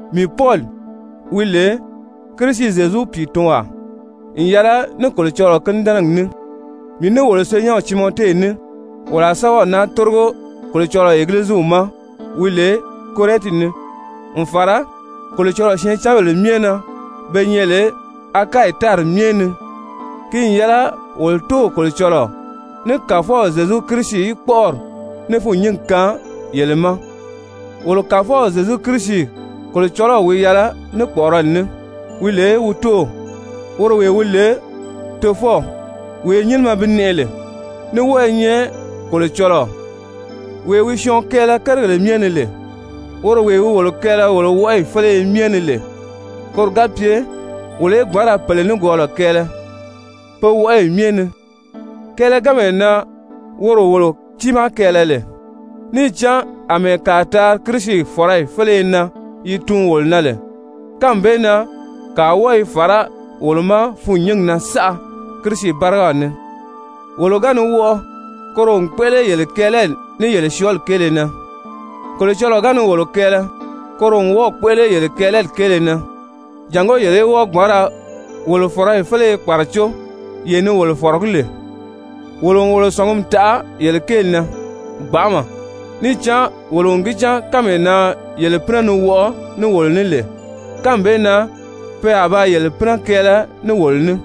Mii Pɔli, wi lè Kirisi Zyezu pìitunwaa n yɛlɛ ní Kolocɔlɔɔ kínidɛnɛgi ní, mii ní wolo senyɛnw Timɔte ní, wolo a sɛ́bɛw naa tórigo Kolocɔlɔɔ Egiliziw ma wi lè Korɛnti ni, n fàra Kolocɔlɔɔ syɛɛncanbèle myɛ na be nyɛ lè Akayi tári myɛ ni. Ki n yɛlɛ wolo Tóow Kolocɔlɔɔ ní Kàfɔw Zyezu Kirisi í kpɔ́ʔɔri ní fûnnyingi kaan yele ma! Wolo Kàfɔw Zyezu Kirisi Kolocɔlɔw wi yɛlɛ ní kpɔ̀ʔɔrɔli ní, wi lè wi Tóow, woro wee wi lè Tofɔw, wee nyínimɛ bi nɛʔɛ lè, ní wɔ́ɔ i nyɛ Kolocɔlɔɔ wee wi syɔɔn kɛɛlɛ kérigèle myɛ ni lè, woro wee wi wolo kɛɛlɛ wolo wɔʔɔyi féleye myɛ ni lè, koro ga pye wolo í gbǎn ra pèle nikwɔɔlɔ kɛɛlɛ pe wɔʔɔyi myɛ ni kɛɛlɛganmee na woro wolo tiimaa kɛɛlɛ lè! Níì cán àmɛɛ kàa taari Kirisi fɔ̀rɔyi féleye na yi tuun wolo na lè, kánmi bee na kàa wɔ́ɔ i fàrá wolo ma fûnnyingi na saʔa Kirisi bárigaw ni. Wolo ga ni wɔʔɔ, koro n kpéʔele yele kɛɛlɛli ní yele syɔ́ɔli kéele na. Kolocɔlɔɔ ga ni wolo kɛɛlɛ, koro n wɔ́ɔ̀ kpéʔele yele kɛɛlɛli kéele na, jàngó yele í wɔ́ɔ gbǎn ra wolo fɔ̀rɔyi féleye kpàracó yee ni wolo fɔ̀rɔgí lè. Wolo n wolo sɔ̀ngumi taʔa yele kéeli na gbanʔama, níì cán wolo n gi cán kánmee na yele pínɛ ni wɔʔɔ ní wolo ní lè, kánmi bee na pe a ba yele pínɛ kɛɛlɛ ní wolo ní.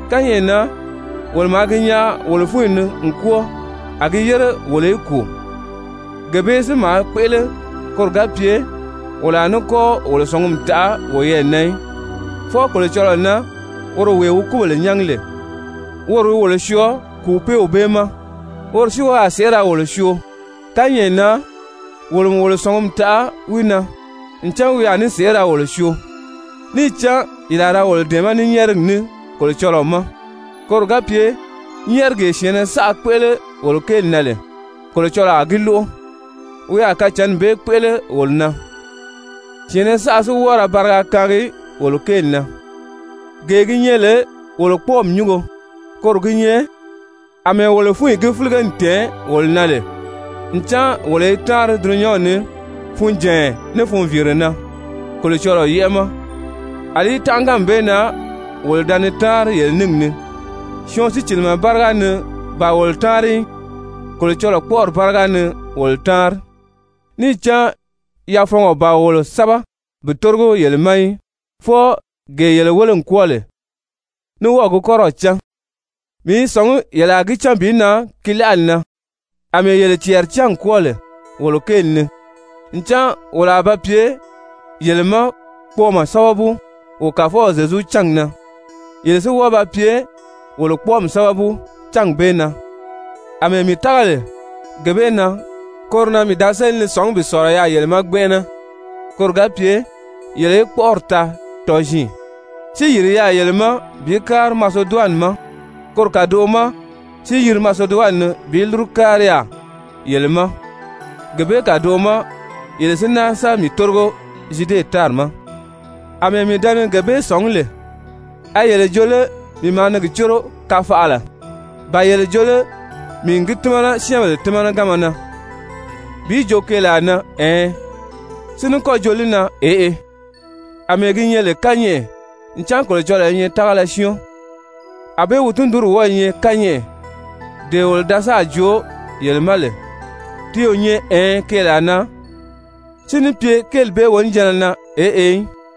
Kányɛʔɛ na wolo maa gi nyaa wolo fúnyi ni n kwɔ́ɔ a gi yére wolo í kùu, gee bee si maa kpéʔele koro ga pye wolo a ní kɔ́ wolo sɔ̀ngumi taʔa woyɛɛ na í, fwɔɔ Kolocɔlɔɔ na woro wee wi kúbèle nyángi lè. Woro wi wolo syɔɔ kùupeew bee ma, woro si wi a sèʔé ra wolo syoo. Kányɛʔɛ na wolo n wolo sɔ̀ngumi taʔa wi na ncan wi a ní sèʔé ra wolo syoo, níì cán yele a ra wolo dɛ̀ɛmɛ́ ní nyɛ́ɛrigi ní Kolocɔlɔɔ ma, koro ga pye nyɛ́ɛrigee syɛ̀ɛnnɛ saʔa kpéʔele wolo kéeli na lè, Kolocɔlɔɔ a gi lóʔo. Wi a kacǎnni bee kpéʔele wolo na, syɛ̀ɛnnɛ saʔa si wɔ́ɔ ra bariga kaangi wolo kéeli na. Gee gi nyɛ lè wolo kpɔ́ɔmi nyúngo, koro gi nyɛ àmɛɛ wolo fúnyi gi fílige n tɛ̀ɛn wolo na lè ncan wolo i táanri dulunyanw ni funjànya ní funviire na Kolocɔlɔɔ yɛ́ʔɛ ma, àlí tánʔaganmi bee na wolo da ni táanri yele níngi ni, syɔɔn sícilimɛ báriga ni ban wolo táanri í, Kolocɔlɔɔ kpɔ́ʔɔri báriga ni wolo táanri. Níì cán yafɔngɔ ban wolo sɛ́bɛ bi tórigo yele ma í, fwɔɔ gee yele wéle n kwɔ́ɔ lè, ní wɔ́ɔ̀ gi kɔ́rɔw cán. Mii i sɔ̀ngí yele a gi cán bi nan gi láʔali na, àmɛɛ yele cɛɛri cán n kwɔ́ɔ lè wolo kéeli ni, ncan wolo a ba pye yele ma kpɔɔmɔ sábabu wo Kàfɔw Zyezu cángi na, yele si wɔ́ɔ ba pye wolo kpɔ́ɔmi sábabu cángi bee na. Amɛɛ mii tága lè gee bee na, koro na mii da séli ni sɔ̀ngí bi sɔ̀lɔ yaà yele ma gbɛnʔɛnɛ, koro ga pye yele í kpɔ́ʔɔri taa tɔziin. Si yìri yaà yele ma bi kári Maseduwani ma, koro kàdoʔo ma si yiri Maseduwani ni bi ní lúru kári yaà yele ma, gee bee kàdoʔo ma yele si náa sa mii tórigo Zyude tári ma. Amɛɛ mii da ni gee bee sɔ̀ngí lè, a yele jo lé mii maa ni gi córo kafaʔala? Ba yele jo lé mii n gi tímana syɛ́ɛnbèle tímanaganma na bi jo keelaa na ɛɛn, si ní kɔ́ jo li na eʔe? Amɛɛ gi nyɛ lè kányɛʔɛ ncan Kolocɔlɔɔ i nyɛ tágala syɔ́ɔn, ànbée wi tundunri wɔ́ɔ̄ nyɛ kányɛʔɛ, dee wolo da sáà joo yele ma lè, ti o nyɛ ɛɛn keelaa na, si ní pye kéeli bee wonijanna na eʔe í.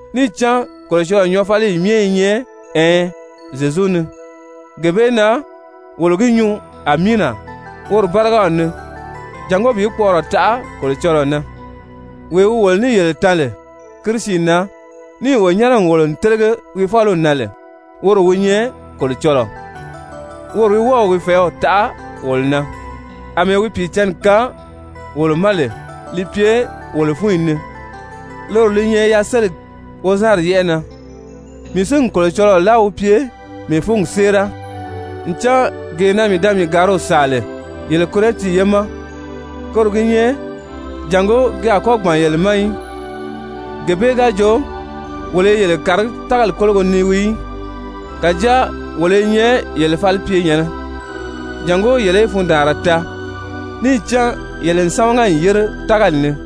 Níì cán Kolocɔlɔɔ nyɔɔfaliyi myɛ i nyɛ ɛɛn Zyezu ni. Gee bee na wolo gi nyuu Amiina woro bárigaw ni jàngó bi kpɔʔɔrɔ taʔa Kolocɔlɔɔ na. Wee wi wolo ní yele tan lè Kirisi na, níì wo nyɛ́nɛ n wòlo n télege wi fáliw na lè, woro wi nyɛ Kolocɔlɔɔ. Woro wi wɔ́ɔ̀ wi fɛ̀ɛ́w taʔa wolo na, àmɛɛ wi Pìicǎnni kaan wolo ma lè li pye wolo fúnyi ni, loro li nyɛ yaseligi wozanri yɛ́ʔɛ na. Mii si n Kolocɔlɔɔ láa wi pye mii fúngi séera, ncan gee na mii da mii gàriw sàa lè yele Korɛnti ye ma, koro gi nyɛ jàngó ki a kɔ́ gbàn yele ma í. Gee bee ga jo wolo i yele kàragí tágali kólogo ni wii í, kàjáa wolo i nyɛ yele falipyenyɛ̀nnɛ, jàngó yele í fundaanra taa, níì cán yele n sámaga n yére tágali ni.